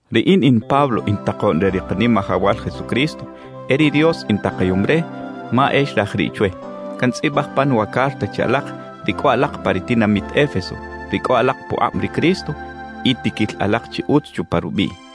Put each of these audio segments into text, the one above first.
Riꞌin in Pablo in takoꞌn re ri Kanimajawal Jesucristo; e ri Dios intakayom re, ma e xraj riꞌ chwe. Cantzꞌibaj pan wa carta che alak ri cꞌo alak pa ri tinamit Éfeso, ri cꞌo alak pukꞌab ri Cristo y tiquil alak chi utz chupa rubiꞌ.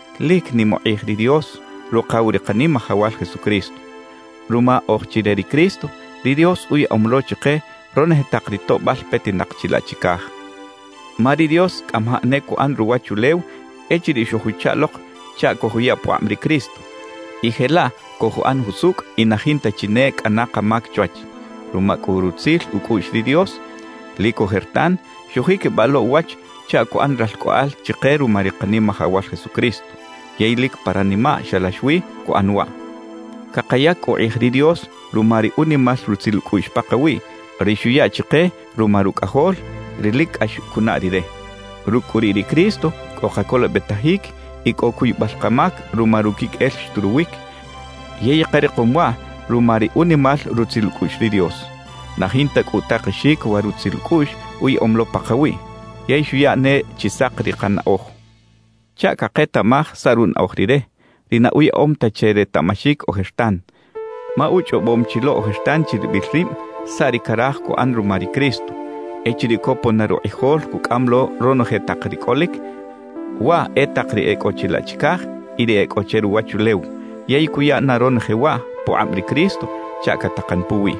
¡Lic nim ukꞌij ri Dios, Rukaw ri Kanimajawal Jesucristo! Ruma oj chi re ri Cristo, ri Dios uyaꞌom lo chike ronoje tak ri toꞌbal petinak chilaꞌ chicaj. Ma ri Dios cꞌamajaꞌ ne cuꞌan ruwachulew echiriꞌ xojuchaꞌ lok chaꞌ cojuya pukꞌab ri Cristo, y jelaꞌ cojuꞌan jusucꞌ y na jinta chi ne cꞌana kamac chwach. Ruma cꞌu rutzil ucꞌuꞌx ri Dios, lic ojertan xujiquibaꞌ lo uwach chaꞌ cuꞌan ralcꞌoꞌal chike ruma ri Kanimajawal Jesucristo. Yey lic pa ranimaꞌ xalax wi cuꞌan waꞌ. Cakayac cꞌu ukꞌij ri Dios ruma ri unimal rutzil ucꞌuꞌx pakawiꞌ, ri xuya chike ruma Rucꞌajol, ri lic cꞌax cunaꞌ Rire. Rucꞌ cꞌu riꞌ ri Cristo cꞌo kacolobetajic y cꞌo cuybal kamac ruma ruquiqꞌuel xturuwic, yey karikom waꞌ ruma ri unimal rutzil ucꞌuꞌx ri Dios. Na jinta cꞌu utakexic wa rutzil ucꞌuꞌx uyaꞌom lo pakawiꞌ. Yey xuya ne chi sak ri kanaꞌoj chaꞌ caketaꞌmaj saꞌ runaꞌoj Rire, ri na uyaꞌom ta che retaꞌmaxic ojertan. Ma uchꞌobom chi lo ojertan chiribil rib saꞌ ri caraj cuꞌan ruma ri Cristo echiriꞌ copon na rukꞌijol cucꞌam lo ronoje tak ri cꞌolic, waꞌ e tak ri e cꞌo chilaꞌ chicaj y ri e cꞌo che ruwachulew, yey cuya na ronoje waꞌ pukꞌab ri Cristo chaꞌ catakan puwiꞌ.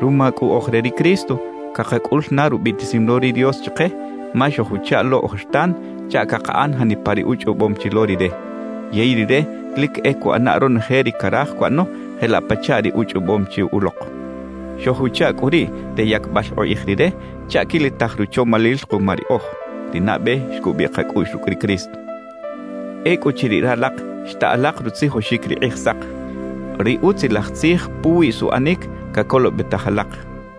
Ruma cꞌu oj re ri Cristo, cakacꞌul na rubiꞌtisim lo ri Dios chike, ma xojuchaꞌ lo ojertan chaꞌ cakaꞌan janipa ri uchꞌobom chi lo Rire. Yey Rire lic e cuꞌana ronoje ri caraj cuꞌano jelaꞌ pachaꞌ ri uchꞌobom chi ulok. Xojuchaꞌ cꞌu riꞌ re yacbal ukꞌij Rire chaꞌ quilitaj ruchomalil kuma riꞌoj, ri nabe xcubiꞌ kacꞌuꞌx rucꞌ ri Cristo. Ecꞌuchiriꞌ ralak xta alak rutzijoxic ri Kꞌijsak, ri Utzilaj Tzij puwi suꞌanic cacolobetaj alak;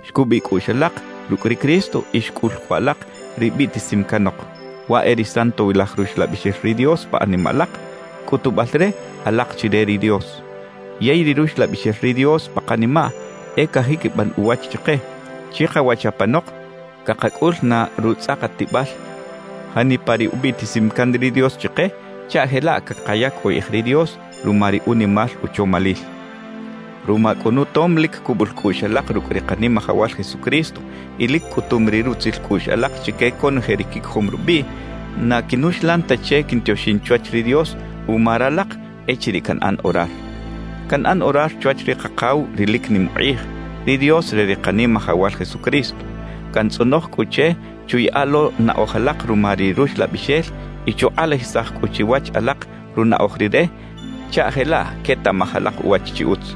xcubiꞌ cꞌuꞌx alak rucꞌ ri Cristo y xcꞌul cꞌu alak ri biꞌtisim canok: Waꞌ e ri Santowilaj Ruxlabixel ri Dios pa animaꞌ alak, cꞌutubal re, alak chi re ri Dios. Yey ri Ruxlabixel ri Dios pa kanimaꞌ e cajiquiban uwach chike, chikawach apanok cakacꞌul na rutzꞌakatibal janipa ri ubiꞌtisim can ri Dios chike chaꞌ jelaꞌ cakayac ukꞌij ri Dios ruma ri unimal uchomalil. Ruma cꞌu nutom lic cubul cꞌuꞌx alak rucꞌ ri Kanimajawal Jesucristo y lic cꞌutum ri rutzil cꞌuꞌx alak chique conoje ri quicojom rubiꞌ, na quinuxlan ta che quintioxin chwach ri Dios uma ralak echiriꞌ canꞌan orar. Canꞌan orar chwach ri Kakaw ri lic nim ukꞌij, ri Dios re ri Kanimajawal Jesucristo. Cantzꞌonoj cꞌu che chuyaꞌa lo naꞌoj alak ruma ri Ruxlabixel y chukꞌalajisaj cꞌu chiwach alak runaꞌoj Rire chaꞌ jelaꞌ quetaꞌmaj alak uwach chi utz.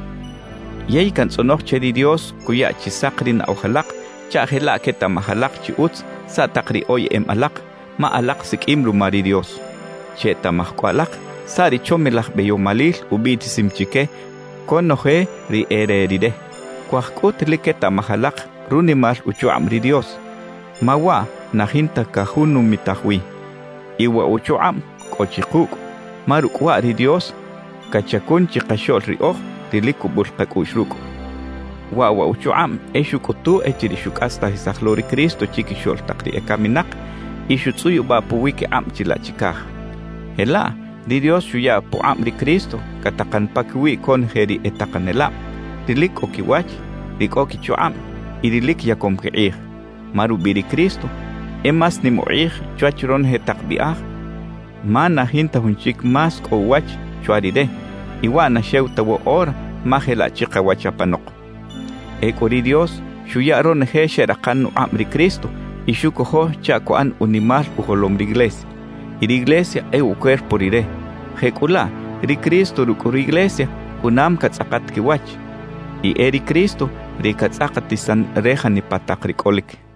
Yey cantzꞌonoj che ri Dios cuya chi sak ri naꞌoj alak chaꞌ jelaꞌ quetaꞌmaj alak chi utz saꞌ tak ri oyeꞌem alak, ma alak siqꞌuim ruma ri Dios. Chetaꞌmaj cꞌu alak saꞌ ri chomilaj beyomalil ubiꞌtisim chique conoje ri e re Rire. Cuaj cꞌut lic quetaꞌmaj alak runimal uchukꞌab ri Dios, ma waꞌ na jinta cajunumitaj wi. Y wa uchukꞌab cꞌo chi kucꞌ, ma rucꞌ waꞌ ri Dios cachacun chikaxoꞌl riꞌoj ri lic cubul kacꞌuꞌx rucꞌ. Waꞌ wa uchukꞌab e xucꞌutu echiriꞌ xucꞌastajisaj lo ri Cristo chiquixoꞌl tak ri ecaminak y xutzꞌuyubaꞌ puwiquikꞌab chilaꞌ chicaj. Jelaꞌ ri Dios xuya pukꞌab ri Cristo catakan paquiwi conoje ri e takanelab, ri lic cꞌo quiwach, ri cꞌo quichukꞌab y ri lic yacom quikꞌij. Ma rubiꞌ ri Cristo e más nim ukꞌij chwach ronoje tak biꞌaj, ma na jinta jun chic más cꞌo uwach chwa Rire; y waꞌ na xew ta woꞌora ma jelaꞌ chikawach apanok. Ecꞌu ri Dios xuya ronoje xeꞌrakan ukꞌab ri Cristo y xucojo chaꞌ cuꞌan unimal ujolom riglesia y riglesia e ucuerpo Rire. Jecꞌulaꞌ ri Cristo rucꞌ riglesia junam catzꞌakat quiwach, y e ri Cristo ri catzꞌakatisan re janipa tak ri cꞌolic.